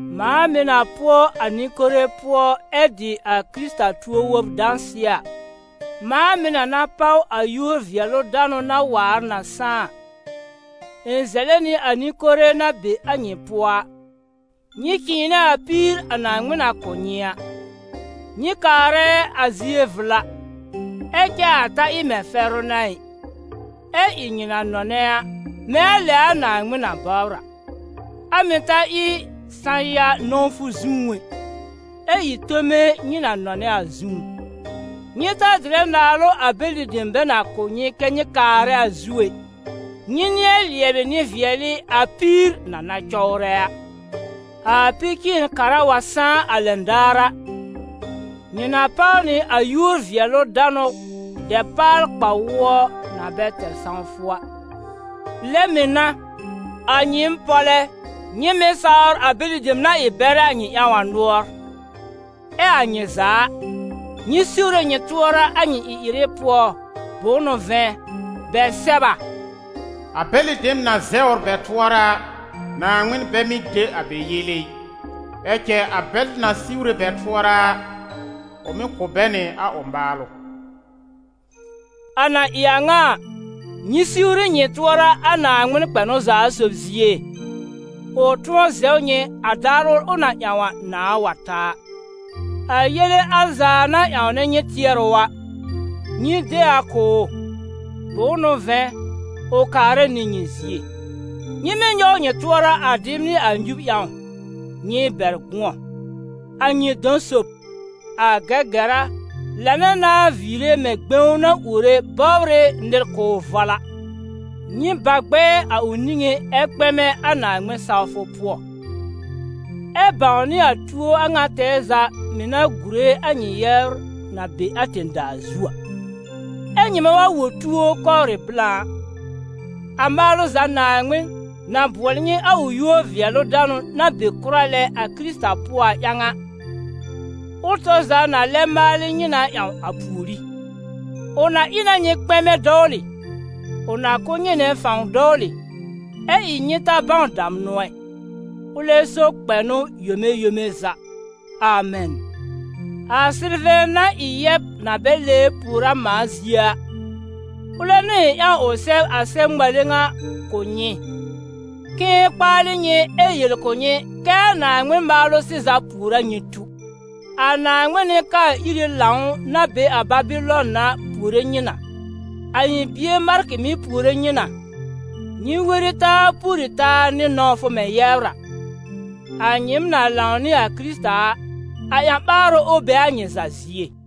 Mãa mɩ̀ na pʋɔ a nɩ-kore pʋɔ ɛ dɩ a Kɩrɩta tuo-wob dãsɩɛ a, mãa mɩ̀ na na páw a yúor-vɩɛlʋ-danʋ na waar na sãá a, ɩ̃ zɛlɛ nɩ a nɩ-kore na be a nyɩ pʋɔ a: nyɩ cɩ̃ɩnɛ a píir a Naaŋmɩn na kʋ̀ nyɩ a. Nyɩ kaarɛ a zie vla, ɛ cɛ a ta ɩ mɛ̃ fɛrʋ n'a ɩ, ɛ ɩ nyɩ na nɔnɛ a, mɛ̃ a lɛ a Naaŋmɩn na bɔbr a; a mɩ̀ ta ɩ sã-ya nɔ̃wfʋ zũú ɛ, ɛ ɩ tome nyɩ na nɔnɛ a zũú. Nyɩ ta dɩrɛ naalʋ a bɛlɩ dem bɛ na kʋ̀ nyɩ kɛ́ nyɩ kaarɛ a zu ɛ, nyɩ nɩ̃ɛ lɩɛbɩ nɩ-vɩɛlɩ a píir na na cɔwrɛ a. A Pi-cɩ̃ɩn-kara wa sãá a lɛn daar a, nyɩ na páw nɩ a yúor-vɩɛlʋ-danʋ dɛpaal-kpa-wʋɔ na bɛ tɛr sãwfʋ a. Lɛ mɩ̀ n'a, a nyɩɩm pɔ́lɛ́, nyɩ mɩ̀ sawr a bɛlɩ dem na ɩ bɛrɛ a nyɩ ƴãw a nʋɔr. Ɛ a nyɩ za a, nyɩ siwre nyɩ tʋɔra a nyɩ ɩ-ɩrɩ pʋɔ, bʋ̃ʋ n'ʋ vɛ̃, bɛ sɛb a: «A bɛlɩ dem na zɛwr bɛ tʋɔra a, Naaŋmɩn bɛ mɩ́ de a bɛ yele ɩ; ɛ cɛ a bɛl na siwre bɛ tʋɔra a, ʋ mɩ́ kʋ̀ bɛ nɩ a ʋ maalʋ.» A na ɩ a ŋa a, nyɩ siwri nyɩ tʋɔra a Naaŋmɩn kpɛnʋ za sob zie, ʋ tʋ̃ɔ zɛw nyɩ a daar ʋl ʋ na ƴãw a, nãa wa ta a. A yele al za na ƴãwnɛ nyɩ tɩɛrʋ a, nyɩ de a kʋ̀ ʋ, bʋ̃ʋ n'ʋ vɛ̃ ʋ kaarɛ nɩ nyɩ zie. Nyɩ mɩ́ nyɔw nyɩ tʋɔra a dɩb nɩ a nyub ƴãw, nyɩ bɛr gʋ̃ɔ! A nyɩ dɔ̃ sob, a Gɛgɛra, lãnɛ na viire mɛ̃ gbẽw na uore bɔbr ɩ nɩr k'ʋʋ vɔl a. Nyɩ ba gbɛɛ a ʋ niŋé ɛ kpɛmɛ a Naaŋmɩn-sawfʋ pʋɔ, ɛ bãwnɩ a tuo a ŋa tɛɛ za mɩ̀ na gùre a nyɩ yɛbr na be a tẽ-daa zu a. Ɛ nyɩmɛ wa wõ tuo kɔwrɩ blã a, a maalʋ za Naaŋmɩn, na bʋɔlɩ nyɩ a ʋ yúor-vɩɛlʋ-danʋ na be kʋra lɛ a Kɩrɩta pʋɔ a ƴãw a, ʋl tɔr za na lɛ maalɩ nyɩ na ƴãw a pùorí; ʋ na ɩ na nyɩ kpɛmɛ dɔwlɩ, ʋ na kʋ̀ nyɩ nɩ fãw dɔwlɩ, ɛ ɩ nyɩ ta bãw damnʋ ɛ. Ʋlɛ so kpɛnʋ yome yome za! Amɛn. A Sɩlvɛ̃, na ɩ yɛb na bɛ lɛbr pùor a mãa zie a, ʋlɛ n'ʋ ɩ̃ ƴãw ʋ sɛb a sɛb-ŋmale ŋa kʋ̀ nyɩ, k'ɩ̃ɩ kpaalɩ nyɩ ɛ yel kʋ̀ nyɩ kɛ́ a Naaŋmɩn maalʋ sɩza pùor a nyɩ tu. A Naaŋmɩn nɩ-kaa-iri lãw, na be a Babɩlɔn a, puore nyɩ na. A ɩ̃ bie Markɩ mɩ̀ puore nyɩ na. Nyɩ weri taa pùori taa nɩ nɔ̃wfʋ mɛ̃ yɛbr a. A nyɩɩm na lãw nɩ a Kɩrɩta a, a ƴã-ɓaarʋ, ʋ be a nyɩ za zie.